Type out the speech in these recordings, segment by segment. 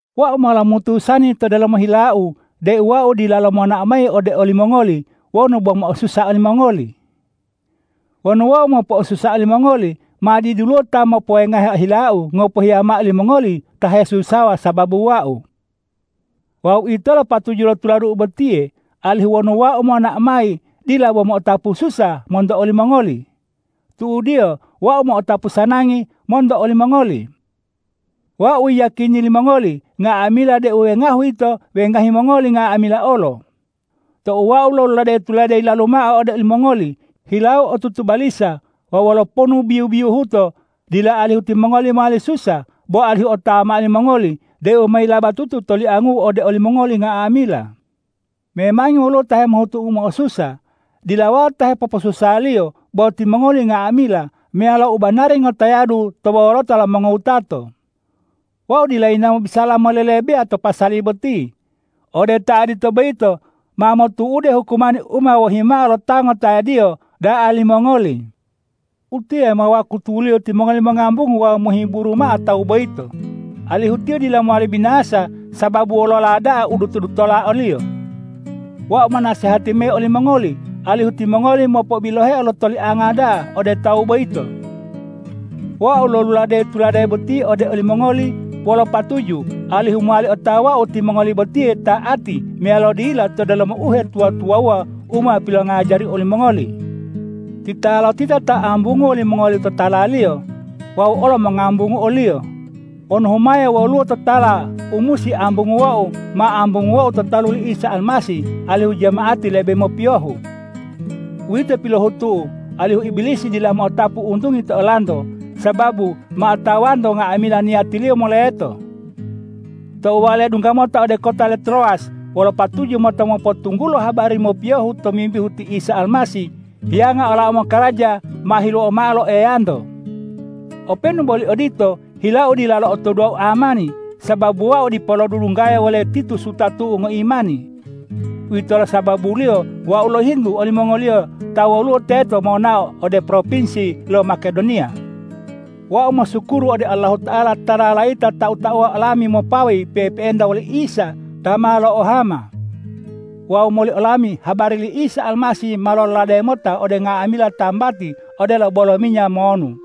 Wau ma lomutusani to delomo hilau deu wau dilalo monao mayi ode olimongoli wonu bo mo'osusa olimongoli. Wonu wau mopo'osusa olimongoli, ma diduluwo ta mopowengahe hilau ngopohiya mao limongoli ta hesusawa sababu wau. Wawu uwitolo patuju lo tuladu'u botiye, alihu wonu wau monao mayi, dila bo mo'otapu ususa monto olimongoli. Tu'udiyo wau mo'otapu usanangi monto olimongoli. Wau yiyakini limongoli nga'amila deu wengahu'u yito wengahi mongoli nga'amila olo. Tou wau loluladeyi tulade yilalu mao ode olimongoli, hilau otutu balisa wawu wolo ponu biyu-biyuhuto, dila alihu timongoli mowali susa, bo alihu otawa mao limongoli deu ma yilabatutu toliangu'u ode olimongoli nga'amila. Memangi woluwo ta hemohutu u mo'osusa. Dila wau ta hepoposusaliyo bo timongoli nga'amila meyalo u banari ngotayadu to wolota lo mongowutato. Wau dila yinawo mobisala molelebeya to pasali boti. Ode ta odito boyito ma motu'ude hukumani u ma wohimao lo ta ngotayadiyo da'a limongoli. Utiye ma wakutuliyo timongoli mongambungu wawu mohiburu mao tawu boyito, alihu tiyo dila mowali binasa sababu wolola da'a u duto-dutola oliyo. Wau monasehati mayi olimongoli alihu timongoli mopobiloheo lo tolianga da'a ode tawu boyito. Wau loluladeyi tulade boti ode olimongoli wolo patuju alihu mowali otawau timongoli botiye ta'ati meyalo dila to delomo uhetuwa-tuwawuwa u ma pilongajariu olimongoli. Titalotita ta ambunguwo limongoli totalaliyo, wau olo mongambungu oliyo. Wonu humaya woluwo totala u musi ambunguwou, ma ambunguwou to talu li Isa Almasih alihu jama'ati lebe mopiyohu. Uwito pilohutu'u alihu Ibilisi dila mo'otapu untungi to olanto, sababu ma otawanto nga'amila niyatiliyo moleto. Tou wau ledungga mota ode kota lo Trowas wolo patuju mota mopotunggulo habari mopiyohu tomimbihu ti Isa Almasih, hiyanga olau mokaraja ma hiluowa mao lo Eyanto. Openu boli odito, hilau dila lo'otoduwo amani, sababu wau dipo lodudunggaya wole Titus wutatu'u ngoimani. Uwitolo sababuliyo wau lohintu olimongoliyo ta woluwo teto monao ode propinsi lo Makedoniya. Wau mosukuru ode Allahuta'ala ta lalayita tau-tauwa olami mopawayi pe'epe'enta woli Isa ta ma lo'ohama. Wawu moli olami habari li Isa Almasih ma lololade mota ode nga'amila tambati odelo bolo minya monu.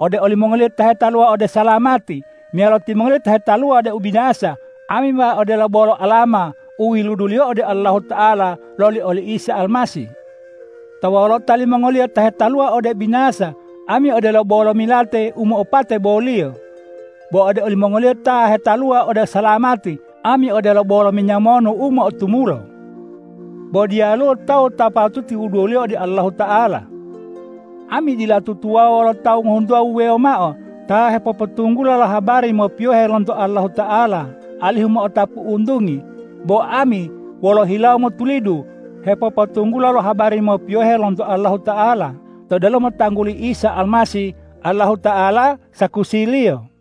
Ode olimongoliyo ta hetaluwa ode salamati meyalo timongoliyo ta hetaluwa ode ubinasa, ami ma odelo bolo alama u yiluduliyo ode Allahuta'ala loli oli Isa Almasih. To wolota limongoliyo ta hetaluwa ode ubinasa, ami odelo bolo milate u mo'opate boliyo; bo ode olimongoliyo ta hetaluwa ode usalamati, ami odelo bolo minya monu u mo'otumulo. Bo diyaluwo tawu ta patuti wuduwoliyo ode Allahuta'ala. Ami dila tutuwawuwa wolo tawu ngohuntuwa wuwewo mao ta hepopotunggula lo habari mopiyohe lonto Allahuta'ala alihu mo'otapu untungi, bo ami wolo hilawo motulidu hepopotunggula lo habari mopiyohe lonto Allahuta'ala to delomo tangguli Isa Almasih. Allahuta'ala sakusiliyo.